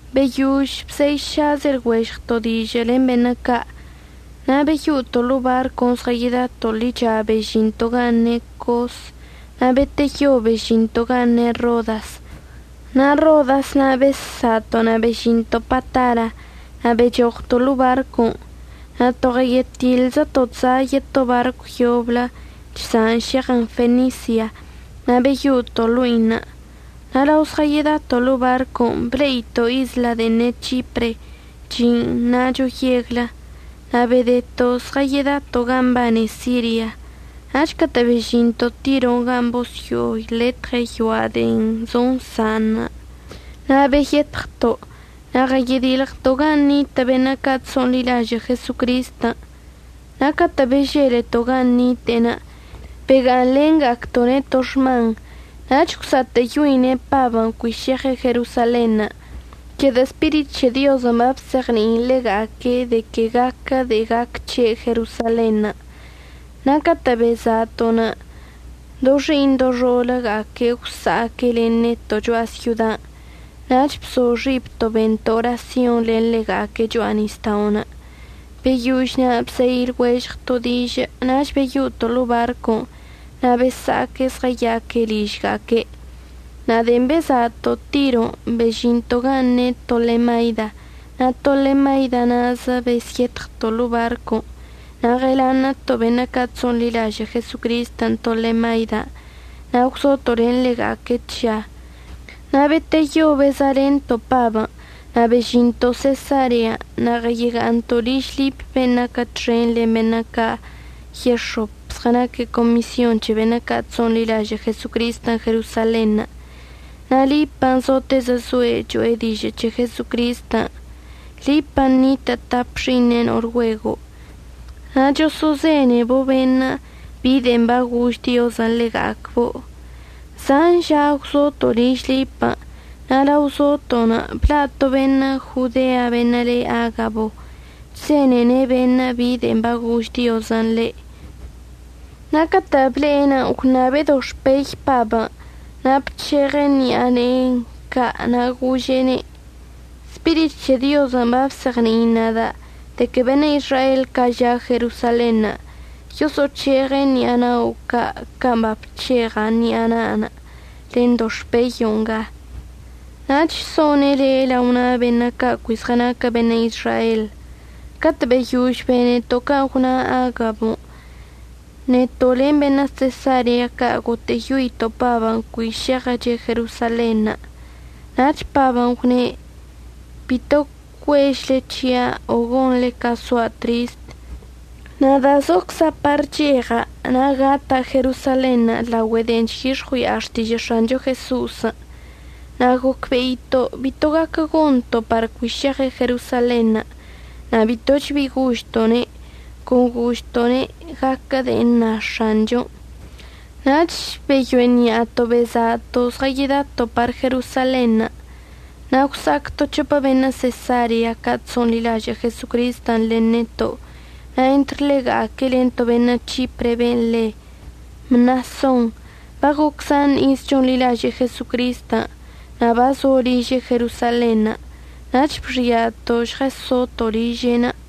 Beyož bzeišazə lɉuežɉto' dižə' len beṉə' ca', na' beyo'oto' ḻo'o barcon' zɉədato' ḻicha bežinto' gan' ne' Cos. Na' beteyo bezžinto' gan' ne' Rodas. Na' Rodas na' bezsa'ato' na' bezžinto' Patara. Na' bechoɉto' ḻo'o barcon'. Na' to ɉəyetiḻzəto' chza' yeto barcw yoblə chza'an šeɉən Fenisia na' beyo'oto' ḻo'inə'. Na' lao zɉəyedato' ḻo'o barcon' ble'ito' isla de'en ne' C̱hipre, chi'in na'acho yeglə. Na' bedeto' zɉəyedato' gan' mbane Siria. Nach catə' bežinto' Tiron' gan' bosyo'oletɉe' yoa' de'en zonsa'anə' na' beyetɉto'. Na' ɉəyedilɉto' gan' nitə' beṉə' ca' chso'onḻilažə' Jesocristən', na' catə' beželeto' gan' nite'enə' bega'aṉlenga'acto'one' to xman. Nach gwsa'atə'əyoine' Pabən' cui šeɉe' Jerosalenṉə' c̱hedə' Spirit c̱he Diozən' babzeɉni'in ḻega'aque' de que gaquə de'en gac c̱he' Jerosalenṉə'. Na' catə' beza'ato'onə' do xi'iṉ do xo'oləga'aque' gwsa'aque' len neto' cho'a syodan', nach bzo xibto' bento' orasyonṉə' len ḻega'aque' cho'a nisda'onə'. Beyož na' bzei lɉuežɉto' dižə' nach beyo'oto' ḻo'o barcon'. Na' besa'aque' zɉəya'aque' ližga'aque'. Na' de'en beza'ato' Tiron' bežinto' gan' ne' Tolemaida na' Tolemaida na'azə bezyetɉto' ḻo'o barcon'. Na' ɉəlaṉə'əto' beṉə' ca' chso'onḻilažə' Jesocristən' Tolemaidan' na' gwzoto' len ḻega'aque' tža. Na' beteyo beza'alento' Pabən' na' bežinto' Sesarean' na' ɉəyega'aṉto' liž Lipən' ben' naquə txen len beṉə' ca' yex̱op zɉənaque' comisyon c̱he beṉə' ca' chso'onḻilažə' Jesocristən' Jerosalenṉə'. Na' Lipən' zotezə zoe' cho'e dižə' c̱he Jesocristən'. Lipən' nitə' tap xi'iṉe' no'ol güego' na' choso'ozenebo' beṉə' bi de'en bagož Diozən' ḻega'acbo'. Zan ža gwzoto' liž Lipən' na' lao zoto'onə' bla' to beṉə' Jodean' beṉə' le Agabo. Chzenene' beṉə' bi de'en bagož Diozən' ḻe'. Na' catə' ble'enə' gwṉabe' doxpey Pabən' na' bc̱heɉən ṉi'a ne'e ca' na' gože'ene': —Spirit c̱he Diozən' babzeɉni'in nada' de que beṉə' Izrael ca' ža' Jerosalenṉə' yoso'oc̱heɉe' ṉi'a na'o ca' can' babc̱heɉ ṉi'a na'anə' len doxpeyo' nga, nach so'one' le' lao na' beṉə' ca' cui zɉənaquə beṉə' Izrael. Catə' beyož beneto' can' gwna Agabən', neto' len beṉə' Sesarea ca' gotə'əyoito' Pabən' par cui šeɉəche' Jerosalenṉə'. Nach Pabən' gwne': —Bito cuežle c̱hia' o gonḻe ca soa' trist. Nada' zocza' par əcheɉa' na' gata' Jerosalenṉə' laogüe de'en chyix̱ɉui'a xtižə' X̱ancho Jeso'osən'. Na' gocbe'ito' bito bi gaquə gonto' par cui šeɉe' Jerosalenṉə', na' bitoch bi gožto'one', con gožto'one': —Gaquə con de'en əṉa X̱anchon'. Nach beyo'eni'ato' beza'ato' zɉədato' par Jerosalenṉə'. Na' gwsa'ac to c̱hopə beṉə' Sesarea ca' chso'onḻilažə' Jesocristən' len neto' na' entr ḻega'aque' len to beṉə' C̱hipren' ben' le Mnason. Bagoc zan iz chonḻilaže'e Jesocristən', na' bazo liže' Jerosalenṉə'. Nach bxia'ato' žɉəsoto' liže'enə'.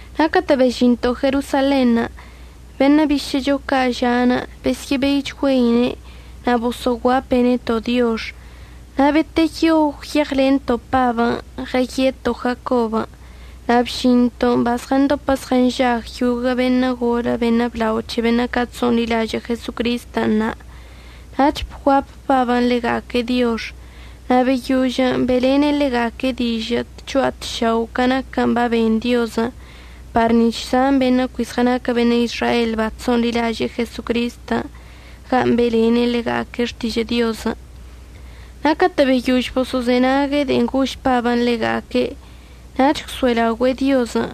Na' catə' bežinto' Jerosalenṉə' beṉə' bišə'əcho ca' ža'anə' besyə'əbeichgüeine' na' boso'oguape' neto' diox. Na' beteyo gwyeɉlento' Pabən' ɉəyeto' Jacobən' na' bžinto'onə' bazɉəndopə zɉənžag yoguə' beṉə' golə beṉə' blao c̱he beṉə' ca' chso'onḻilažə' Jesocristən' na'. Nach bguap Pabən' ḻega'aque' diox na' beyožən' be'elene' ḻega'aque' dižə' tcho'a tšao' ca naquən' baben Diozən' par nic̱h zan beṉə' cui zɉənaquə beṉə' Izrael bachso'onḻilaže'e Jesocristən' gan' be'elene' ḻega'aque' xtižə' Diozən'. Na' catə' beyož boso'ozenague' de'en gož Pabən' ḻega'aque' nach gwso'elaogüe'e Diozən'.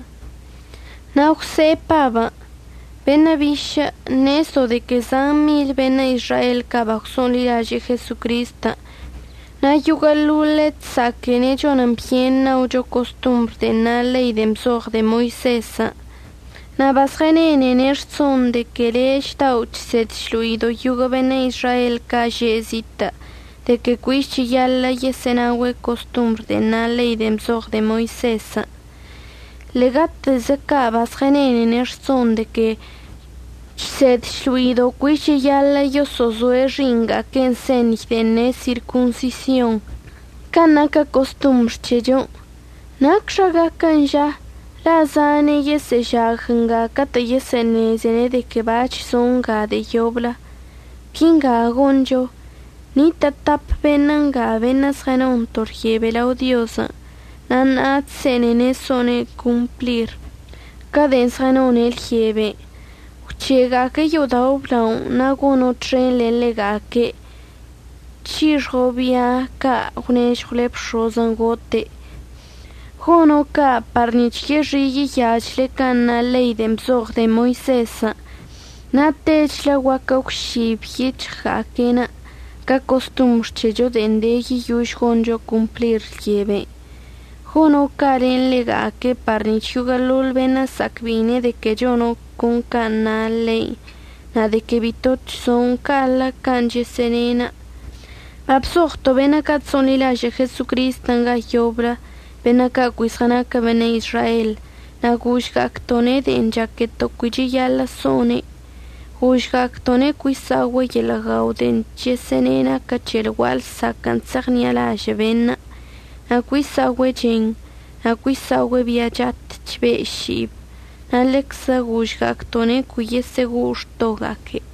Na' gwse'e Pabən': —Beṉə' bišə' ṉezdo' de que zan mil beṉə' Izrael ca' bagwso'onḻilaže'e Jesocristən' na' yoguə'əḻoḻe' chsa'aquene' chonən byen ṉaocho costombr de'en na ḻei de'en bzoɉ de'e Moisezən'. Na' bazɉənenene' rson de que le' chdao' chsed chlo'ido' yoguə' beṉə' Izrael ca' že'e zitə' de que cuich cheyaḻə' yesə'ənaogüe' costombr de'en na ḻei de'en bzoɉ de'e Moisezən'. Ḻe'egatezə ca' bazɉənenene' rson de que chsed chlo'ido' cuich cheyaḻə' yoso'ozoe' xi'iṉga'aque'enə' señy de'en ne' sirconsisionṉə' can' naquə costombr c̱hechon'. ¿Nacxa gaquən' ža? la' zane' yesə'əžag nga catə' yesə'əṉezene' de que bac̱h zo' nga de'e yoblə. Quinga goncho. Nitə' tap beṉə' nga beṉə' zɉənon to lyebe lao Diozən' na' ṉa'a chse'enene' so'one' complir ca de'en zɉənone' lyebe. Gwc̱he'ega'aque' yo'odao' əblaonə' na' gono' txen len ḻega'aque' c̱hixɉo' bia ca' əgwnežɉwle bx̱ozən' gote'. Gono' ca' par nic̱h yexi' yeyachle can' na ḻein' de'en bzoɉ de'e Moisezən' na' techlə guaquə əgwžib yic̱hɉga'aque'enə' ca costombr c̱hecho de'en de yeyož goncho complir lyeben'. Gono' ca' len ḻega'aque' par nic̱h yoguə'əḻoḻ beṉə' əsa'acbe'ine' de que chono' can' na ḻeinə' na' de que bito chzo'on ca'aḻə can' chəsə'əne'. Babzoɉto' beṉə' ca' chso'onḻilažə' Jesocristən' ga yoblə beṉə' ca' cui zɉənaquə beṉə' Izrael, na' gožga'acto'one' de'en chaqueto' cui cheyaḻə' so'one'. Gožga'acto'one' cui sa'ogüe' yeḻə' guao de'en chəsə'əne' naquən c̱he lgua'a lsaquə'ən chse'eɉṉi'alažə' beṉə', na' cui sa'ogüe' chen, na' cui sa'ogüe' bia chat chbe' ši'ib. Na' ḻeczə gožga'acto'one' cui yesə'əgo'o xtoga'aque'.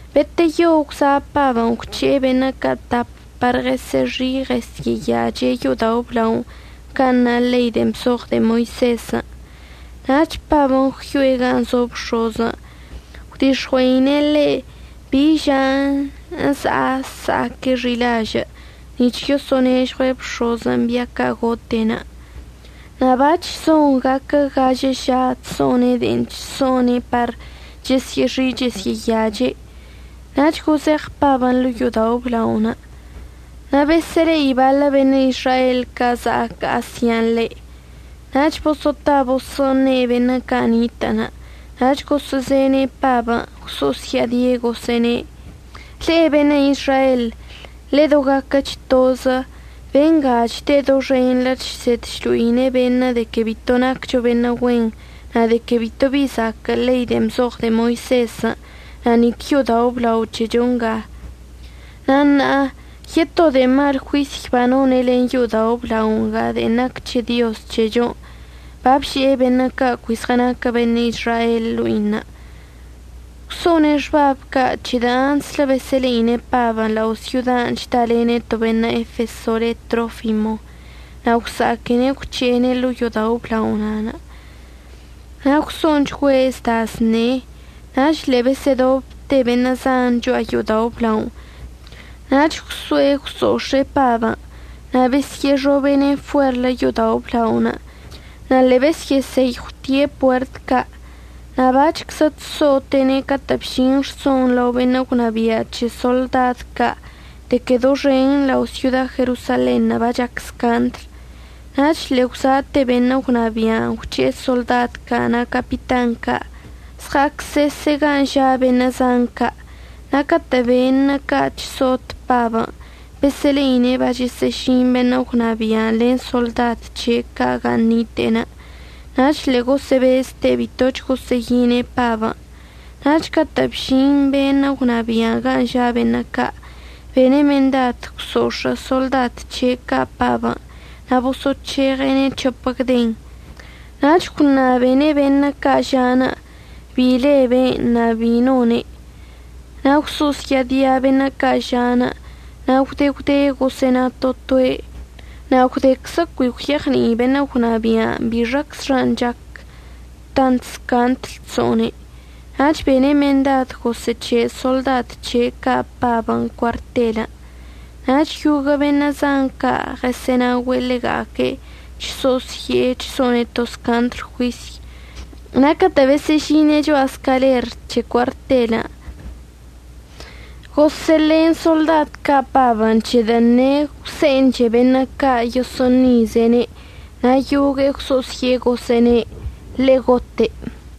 Beteyo gwza' Pabən' gwc̱he'e beṉə' ca' tap par yesyə'əxi' yesyə'əyache' yo'odao' əblaonə' can' na ḻei de'en bzoɉ de'e Moisezən'. Nach Pabən' gwyo'e gan' zo bx̱ozən' gwdix̱ɉue'ine' ḻe' bi žan' əza'a əsa'aque' xi'ilažə' nic̱h yoso'onežɉue' bx̱ozən' bia ca' gote'enə'. Na' bac̱h zon gaquə gažə ža chso'one' de'en chso'one' par chesyə'əxi' chesyə'əyache', nach gozeɉ Pabən' ḻo'o yo'odao' əblaonə'. Na' besə'əle'i baḻə beṉə' Izrael ca' za'ac Asian' ḻe', nach boso'ota boso'oṉe' beṉə' ca' nitə'ənə'. Nach gosə'əzene' Pabən'. Gwso'osya'adie' gosə'əne': —Le'e beṉə' Izrael, ḻedogaquəch tozə. Benga chde' doxenḻə chsed chlo'ine' beṉə' de que bito naccho beṉə' güen na' de que bito bi zaquə' ḻei de'en bzoɉ de'e Moisezən' na' nic yo'odao' əblao c̱hecho nga. Na' ṉa'a yeto de'e mal juisy banone' len yo'odao' əblao nga de'en naquə c̱he Dioz c̱hechon', babže'e beṉə' ca' cui zɉənaquə beṉə' Izrael ḻo'inə'. Gwso'one' xbabən' ca' c̱hedə' antslə besə'əle'ine' Pabən' lao' syodan' chdalene' to beṉə' Efeso le Trofimo na' gwsa'aquene' gwc̱he'ene' ḻo'o yo'odao' əblaonə'. Na' gwso'onchgüe' zda zṉe. Nach ḻe'e besə'ədobte beṉə' zan cho'a yo'odao' əblaonə' nach gwso'e gwso'ox̱e'e Pabən' na' besyə'əxobe'ene' fuerlə yo'odao' əblaonə', na' ḻe'e besyə'əseyɉwte puert ca'. Na' bac̱hczə chso'ote'ene' catə' bžin rsonṉə' lao beṉə' gwnabia' c̱he soḻdad ca' de que doxen lao' syoda Jerosalenṉə' bachac scandlən'. Nach ḻe'e gwza'ate beṉə' gwnabia'anə' gwc̱he'e soḻdad ca' na' capitan ca', əzɉa'acsese' gan' ža' beṉə' zan ca'. Na' catə' beṉə' ca' chso'ot Pabən' besə'əle'ine' bachəsə'əžin beṉə' gwnabia'anə' len soḻdad c̱he' ca' gan' nite'enə', nach ḻe'e gosə'əbezte' bitoch gosə'əyine' Pabən'. Nach catə' bžin beṉə' gwnabia'anə' gan' ža' beṉə' ca', bene' mendad gwso'ox̱ə' soḻdad c̱he' ca' Pabən' na' boso'oc̱heɉe'ene' c̱hopə gden. Nach gwṉabene' beṉə' ca' ža'anə' bi le be'enə' na' bin' none'. Na' gwso'osya'adia beṉə' ca' ža'anə', na' gwde gwde gosə'əna to toe', na' gwdeczə cui gwyeɉni'i beṉə' gwnabia'anə' bixaczxan' chac tant scaṉdl chso'one'. Nach bene' mendad gosə'əc̱he' soḻdad c̱he' ca' Pabən' cuartelən'. Nach yoguə' beṉə' zan ca' ɉəsə'ənaogüe' ḻega'aque' chso'osye'e chso'one' to scaṉdl juisy. Na' catə' besə'əžine' cho'a scaler c̱he cuartelən' gosə'əlen soḻdad ca' Pabən' c̱hedə' ṉe'e gwse'enche beṉə' ca' yoso'oṉize'ene' na' yogue'e gwso'osye'e gosə'əne': —Ḻe'e gote'.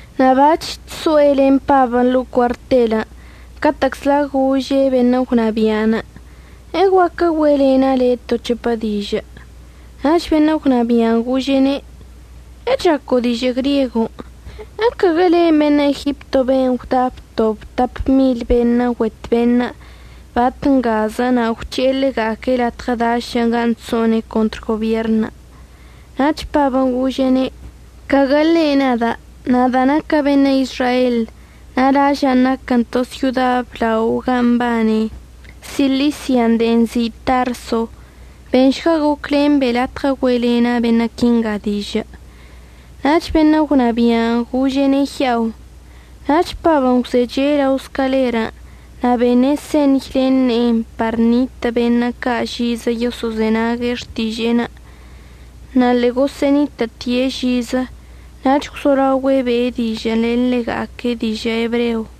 Na' bac̱h chso'e len Pabən' ḻo'o cuartelən' catə'əczla gože' beṉə' gwnabia'anə': —¿Eguaquə güe'elena' le'e to c̱hopə dižə'? Nach beṉə' gwnabia'anə' gože'ene': —¿Echaco' dižə' griego? ¿Ecaguə len' beṉə' Egipto ben' gwda btob tap mil beṉə' güet beṉə' bat ngazə na' gwc̱he'e ḻega'aque' latɉə dašən' gan' chso'one' contr gobierṉən'? Nach Pabən' gože'ene': —Caguə ḻe' nada'. Nada' naca' beṉə' Izrael na' laža'anə' naquən to syoda blao gan' mbane Silisia de'en nzi' Tarso. Benšga goclen be' latɉə güe'elena' beṉə' quinga dižə'. Nach beṉə' gwnabia'anə' gože'ene' ya'o. Nach Pabən' gwzeche' lao scalerən' na' bene' señy len ne'enə' par ṉitə' beṉə' ca' žizə yoso'ozenague' xtiže'enə', na' ḻegosə'ənitə'ətie' žizə. Nach gwzolaogüe' be'e dižə'ən len ḻega'aque' dižə' ebreo.